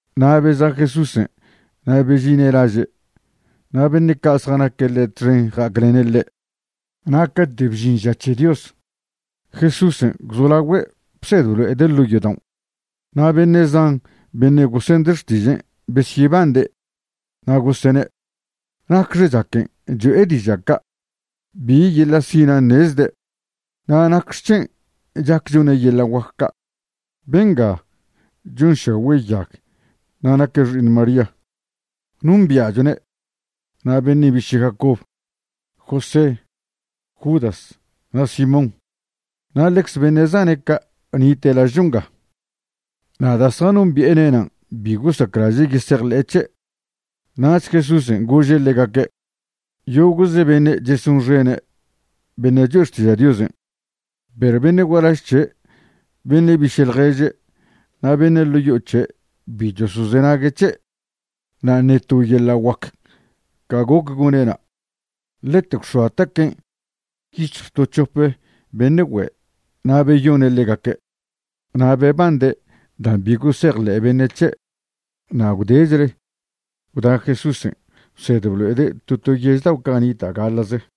Na' beza' Jesúsen' na' bežine' laže', na' beṉe' ca' zjanaque' ḻe' txen ja'aclene' ḻe'. Na' cate' bžin ža c̱he Dios, Jesúsen' gwzolagüe' bsed blo'ede' ḻo' yodaon'. Na' beṉe' zan beṉe' gosende' xtižen' besyebande' na' gosene': ―¿Nacxe chaquen' cho'e diža' ca'? ¿Bi yeḻa' sinan' ṉezde'? na' ¿nacxec̱hen' chac chone' yeḻa' guac ca'? Benga chonšagüe' yag na' naque' xi'iṉ María. Nombia'chwne' na' beṉe' biše' Jacobo, José, Judas na' Simón, na' ḻecze beṉe' zane' ca' nite' lažcho nga. Na' da' zjanombi'ene' nan' bi gosaclaže' yesejḻe'e c̱he'. Nach Jesúsen' gože' ḻegaque': ―Yogo'ze beṉe' chesonxene' beṉe' choe' xtiža' Diosen', perw beṉe' gualaž c̱he', beṉe' biše' ḻježe' na' beṉe' ḻo' yo'o c̱he' bi chosozenague' c̱he'. Na' ṉe to yeḻa' guac ca goc gone' na', ḻete gwx̱oa taquen' yic̱hj to c̱hop beṉe' güe' na' beyone' ḻegaque'. Na' bebande' dan' bi gosejḻe' beṉe' c̱he'. Na' gwdechle gwda Jesúsen' bsed blo'ede' to to yež dao' ca' nita' gaḻa'ze.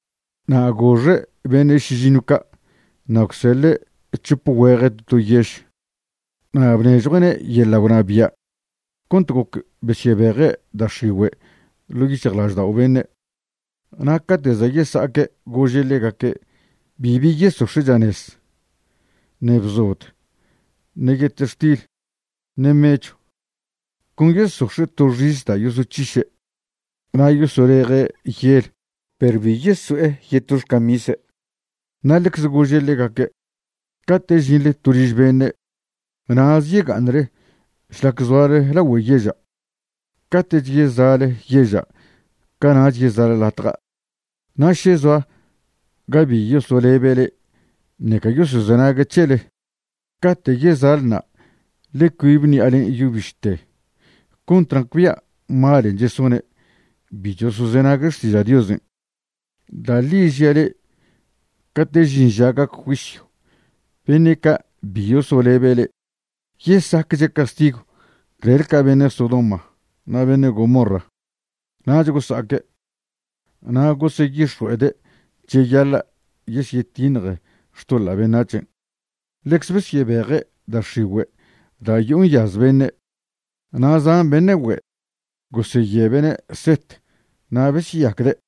Na' goxe' beṉe' šižiṉw ca' na' gwseḻe' c̱hop güeje' to to yež, na' bnežjue'ne' yeḻa' gwnabia' cont goc besyebeje' da' x̱igüe' ḻo' yic̱hjlaždao' beṉe'. Na' cate' za' yesa'aque' gože' ḻegaque' bibi yesox̱e' chanez, ṉe bzod, ṉe yetextil, ṉe mechw, con yesox̱e' to xis da' yosoc̱hiše'. Na' yosoleje' yel perw bi yesoe' yeto xcamise'. Na' ḻecze gože' ḻegaque': ―Cate' žinḻe to liž beṉe', na'ze yega'aṉle šlac zoale lagüe yeža', cate'ch yeza'le yeža' cana'ch yeza'le latja'. Na' še zoa ga bi yosolebe' le'e ṉeca yosozenague' c̱hele, cate' yeza'le na' ḻe cuibe ṉi'alen' yo bište cont nacbia' malen' chesone' bi chosozenague' xtiža' Diosen'. Da' ḻi žia' le'e cate' žin ža gac juisyw beṉe' ca' bi yosolebe' le'e yesacche' castigw clel ca beṉe' Sodoma na' beṉe' Gomorra. Nach gosa'aque', na' goseyix̱jue'ede' cheyaḻa' yesyetiṉje xtoḻa' beṉac̱hen'. Ḻeze besyebeje' da' x̱igüe' da' yo'o nyaz beṉe', na' zan beṉe' güe' goseyebe'ne' set na' besyeyacde'.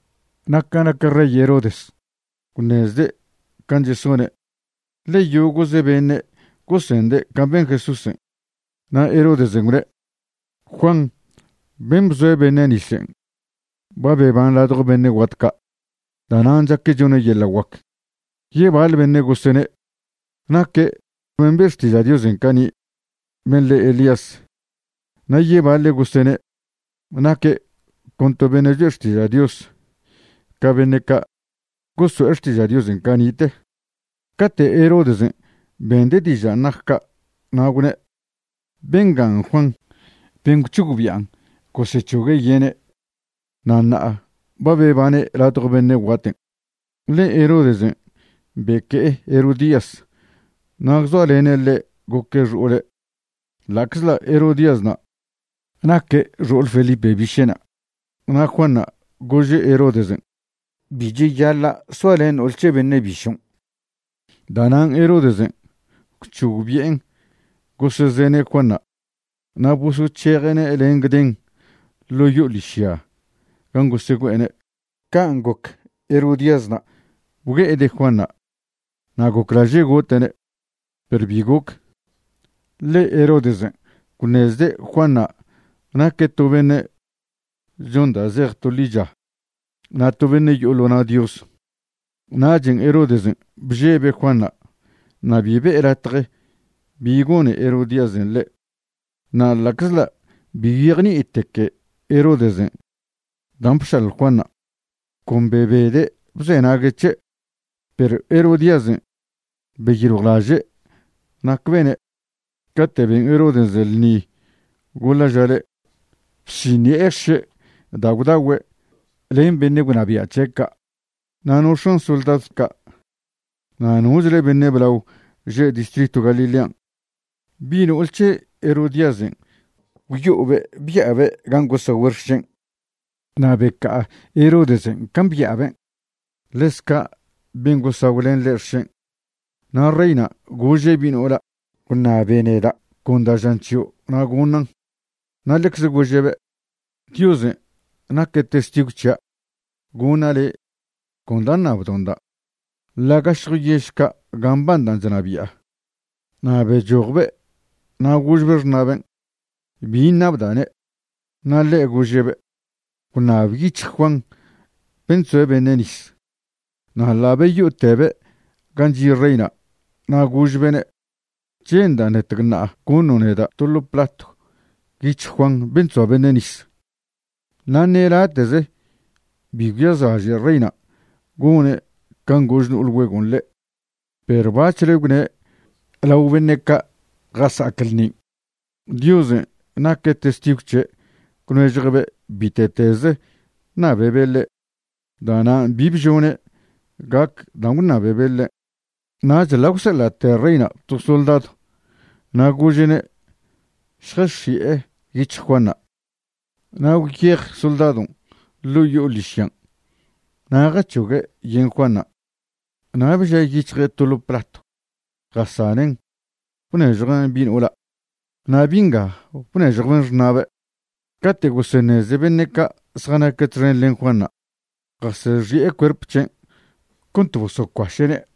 Na' ca nac rey Herodes, gwṉezde' can' chesone', ḻe yogo'ze beṉe' gosende' can' ben Jesúsen'. Na' Herodesen' gwne': ―Juan ben' bzoe' beṉe' nisen' ba beban ladjo beṉe' guat ca'. Da'nan' chaque' chone' yeḻa' guac. Yebaḻe beṉe' gosene': ―Naque' ben' be' xtiža' Diosen' cani', ben' le Elías. Na' yebaḻe' gosene': ―Naque' con to beṉe' choe' xtiža' Dios ca beṉe' ca' gosoe' xtiža' Diosen' cani'te. Cate' Herodesen' bende' dižan' nac ca' na' gwne': ―Bengan' Juan ben' gwc̱hogbi'an gosec̱hogue' yene', na' ṉa'a ba bebane' ladjo beṉe' guaten'. Ḻe Herodesen' beque'e Herodías na' gwzoalene' ḻe' goque' xo'ole' ḻa'czḻa' Herodíasna' naque' xo'ole Felipe biše'na'. Na' Juanṉa' gože' Herodesen': ―Bi cheyaḻa' soalen no'ol c̱he beṉe' bišon'. Da'nan' Herodesen' gwc̱hogbi'en gosezene' Juanṉa' na' bosoc̱heje'ne' len gden ḻo' yo'o ḻižya gan' gosegüe'ene'. Can' goc Herodíasna' bgue'ede' Juanṉa' na' goclaže' gote'ne', perw bi goc. Ḻe Herodesen' gwṉezde' Juanṉa' naque' to beṉe' chon da' zej to ḻicha na' to beṉe' yo'o ḻo na' Dios, nachen' Herodesen' bžebe' Juanṉa' na' bi be'e latje bi gone Herodíasen' ḻe'. Na' ḻa'czḻa' bi gwyejni'iteque Herodesen' dan' bšalj Juanṉa', con bebede' bzenague' c̱he'. Perw Herodíasen' beyiljwlaže' nac bene' cate' ben Herodesen' ḻṉi goḻa' ža le', bsiṉi'e xše' da' gwdagüe' len beṉe' gwnabia' c̱he' ca' na' no x̱an soldadw ca' na' nochle beṉe' blao že' distritw Galilean'. Bi' no'ol c̱he Herodíasen' gwyo'obe' bya'abe' gan' gosagüe' xšen' na' beca'a Herodesen' can' bya'aben', ḻez ca' ben' gosagw len ḻe' xšen'. Na' reyna' gože' bi' no'ola': ―Gwṉabe neda' con da' žan c̱hio' na' goṉan'. Na' ḻecze gože'be': ―Diosen' naque' testigw c̱hia' goṉa' le' con da' ṉabdo'nda', ḻa' gašjo yež ca' gan' mbanda' chnabi'a. Na' bechojbe' na' gožbe' xṉa'ben': ―¿Bi ṉabda'ne'? Na' ḻe' gože'be': ―Gwṉab yic̱hj Juan ben' chzoe' beṉe' nis. Na' ḻa' beyo'otebe' gan' chi' reyna' na' gožbe'ne': ―Che'nda' ṉetecṉa'a goṉo' neda' to ḻo' platw yic̱hj Juan ben' chzoa beṉe' nis. Na' ṉe late'ze bi gwyazlaže' reyna' gone' can' gož no'ol güegon' ḻe', perw bac̱hle gwne' lao beṉe' ca' jasa'ac ḻṉin' Diosen' naque' testigw c̱he' gwnežjue'be' bite'teze ṉabebe' ḻe', da'nan' bi bžone' gac dan' gwṉabebe' ḻe'. Nach ḻa' gwseḻa'te reyna' to soldadw na' gože'ne' šjax̱i'e yic̱hj Juanṉa'. Na' gwyej soldadon' ḻo' yo'o ḻižyan' na' jac̱hogue' yen Juanṉa', na' bžie' yic̱hje' to ḻo platw jasanen' bnežjuen' bi' no'ola', na' bi' nga bnežjwben' xṉa'be'. Cate' goseṉeze beṉe' ca' zjanaque' txen len Juanṉa', jasexi'e cuerp c̱hen' cont bosocuaše'ne'.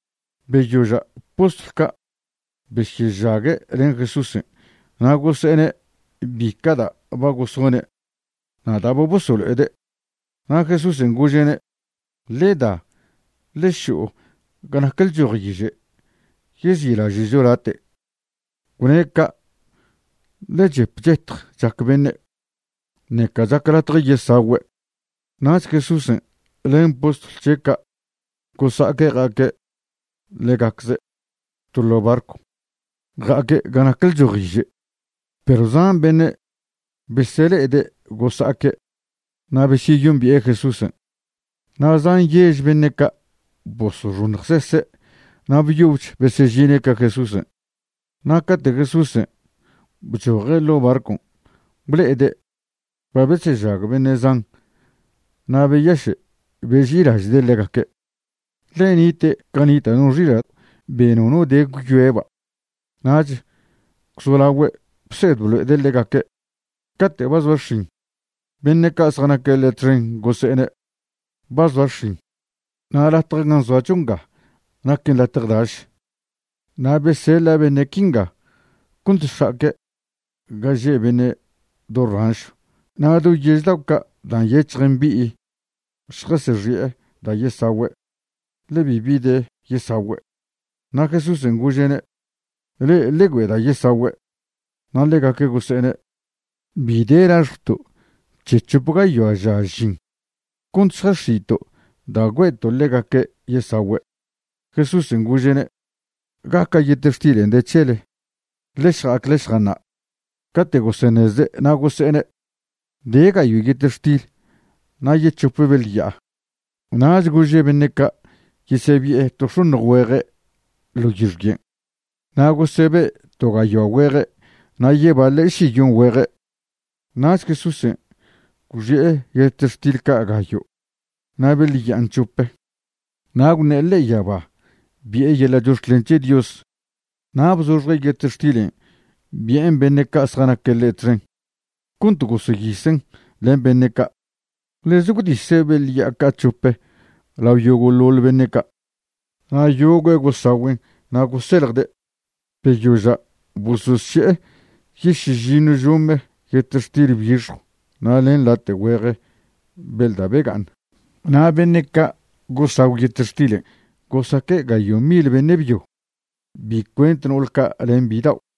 Beyoža' postlw ca' besyežague' len Jesúsen' na' gose'ene' bica' da' ba gosone' na' da' ba bosolo'ede'. Na' Jesúsen' gože'ne': ―Ḻe da, ḻe šo'o ga nac lchojiže' yezi'laže'cho late'. Gwne' ca' ḻe chep chetj chac beṉe', ṉeca chac latje yesagüe'. Nach Jesúsen' len postlw c̱he' ca' gosa'aque' ja'aque' ḻegacze' to ḻo' barcw, ja'aque' ga nac lchojiže'. Perw zan beṉe' besele'ede' gosa'aque' na' besyeyombi'e Jesúsen', na' zan yež beṉe' ca' bosoxoṉjsese' na' byobch besežine' ca Jesúsen'. Na' cate' Jesúsen' bchoje' ḻo' barcon' ble'ede' ba besežag beṉe' zan na' beyaše' beži'ilaže'de' ḻegaque', ḻe nite' ca nita' no xila' be nono de gwyoeba'. Nach gwzolaogüe' bsed blo'ede' ḻegaque'. Cate' ba zoa x̱in, beṉe' ca' zjanaque' ḻe' txen gose'ene': ―Ba zoa x̱in, na' latj gan' zoacho nga naquen latj daš. Na' beseḻa' beṉe' quinga cont šja'aque' ga že' beṉe' do ranšw na' do yež dao' ca' dan' nyec̱hj mbi'i šjasexi'e da' yesagüe', ḻe bibi de yesagüe'. Na' Jesúsen' gože'ne': ―Le'e ḻe güe'e da' yesagüe'. Na' ḻegaque' gose'ene': ―Bi de laxjwto' c̱he c̱hop gayoa ža žin cont šjax̱i'to' da' güe'to' ḻegaque' yesagüe'. Jesúsen' gože'ne': ―¿Gaca' yetextilen' de c̱hele? Ḻe šja'ac ḻe šjaṉa'. Cate' goseṉezde' na' gose'ene': ―De gayo' yetextil na' yec̱hop beḻ ya'a. Nach gože' beṉe' ca' yesebi'e to x̱oṉj güeje' ḻo yixyen'. Na' gosebe' to gayoa güeje' na' yebaḻe' šiyon güeje'. Nach Jesúsen' gwxi'e yetextil ca' gayo' na' beḻ ya'an c̱hope, na' gwṉe'e ḻe'e yaba bi'e yeḻa' chox̱clen c̱he Dios na' bzoxje' yetextilen' bi'en beṉe' ca' zjanaque' ḻe' txen cont goseyisen' len beṉe' ca'. Ḻeze gwdise' beḻ ya'a ca' c̱hop lao yogo'ḻoḻ beṉe' ca'. Na' yogüe' gosagüen' na' goseljde'. Beyoža' bososše'e yešižiṉw žome yetextil bixjw na' len late' güeje beḻ da' bega'aṉ. Na' beṉe' ca' gosagw yetextilen' gosaque' gayo' mil beṉe' byo, bi cuent no'ol ca' len bidao'.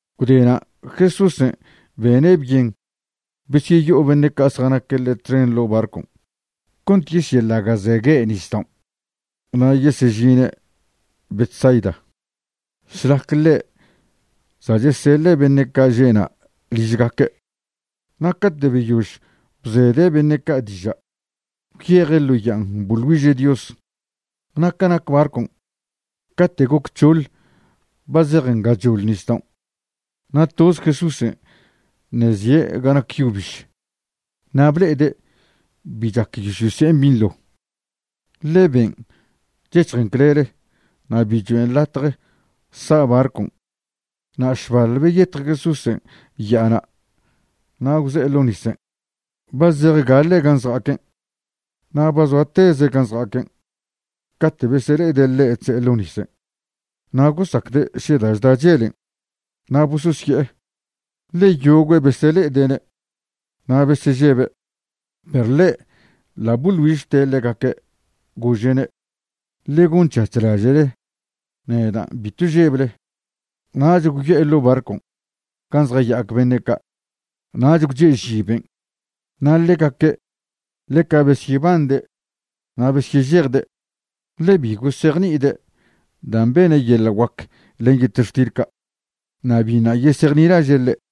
Gwdena' Jesúsen' bene' byen besyeyo'o beṉe' ca' zjanaque' ḻe' txen ḻo' barcon' cont yesyeḻaga'zegue' nisdaon' na' yesežine' Betsaida, šlac ḻe' za' cheseḻe' beṉe' ca' žena' ližgaque'. Na' cate' beyož bzede' beṉe' ca' diža', gwyeje' ḻo ya'an boḻ güiže' Dios. Na' ca nac barcon', cate' goc c̱hoḻ ba zejen gachoḻ nisdaon', na' toze Jesúsen' ṉe' zie' ga nac yo biž. Na' ble'ede' bi chac yosyose'en binḻo, ḻe ben' chec̱hjen clele na' bi choen' latje sa' barcon'. Na' šbaḻ beyetj Jesúsen' ya'ana' na' gwze'e ḻo nisen' ba zej gaḻe' gan' zja'aquen', na' ba zoa teze' gan' zjaya'aquen' cate' besele'ede' ḻe' chze'e ḻo nisen'. Na' gosacde' še da' chda chelen'. Na' bososye'e. Ḻe yogüe' besele'ede'ne' na' besežebe'. Perw ḻe' ḻa' boḻ güižte' ḻegaque', gože'ne': ―Ḻe gonc̱hac̱h laže'le; nedan', bitw žeble. Nach gwyo'e ḻo' barcw gan' zjaya'ac beṉe' ca', nach gwche'ži ben'. Na' ḻegaque' ḻeca besyebande' na' besyežejde', ḻe bi gosejni'ide' dan' bene' yeḻa' guac len yetextil ca', na' biṉa' yesejnilaže' ḻe'.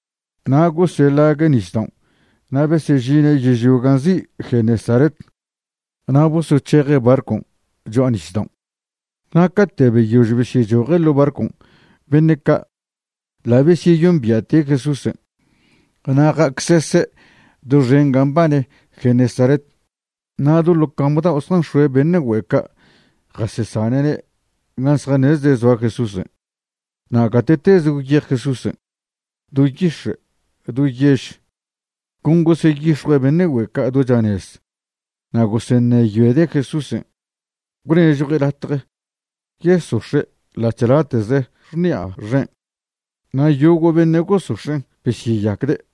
Na' goseḻague' nisdaon' na' besežine' yežlio gan' nzi' Genesaret, na' bosoc̱heje' barcon' cho'a nisdaon'. Na' cate' beyož besyechoje' ḻo' barcon' beṉe' ca' ḻa' besyeyombia'te' Jesúsen'. Na' ja'acsese' doxen gan' mbane Genesaret, na' do ḻo cam dao' zjanx̱oe' beṉe' güe' ca' jasesane'ne' gan' zjaṉezde' zoa Jesúsen'. Na' gate'teze gwyej Jesúsen', do yix̱e', do yež, con goseyix̱jue' beṉe' güe' ca' do chanez na' goseṉeyoede' Jesúsen' gwnežjue' latje yesox̱e' ḻa'ch late'ze x̱ni'a xen', na' yogo' beṉe' gosox̱en' besyeyacde'.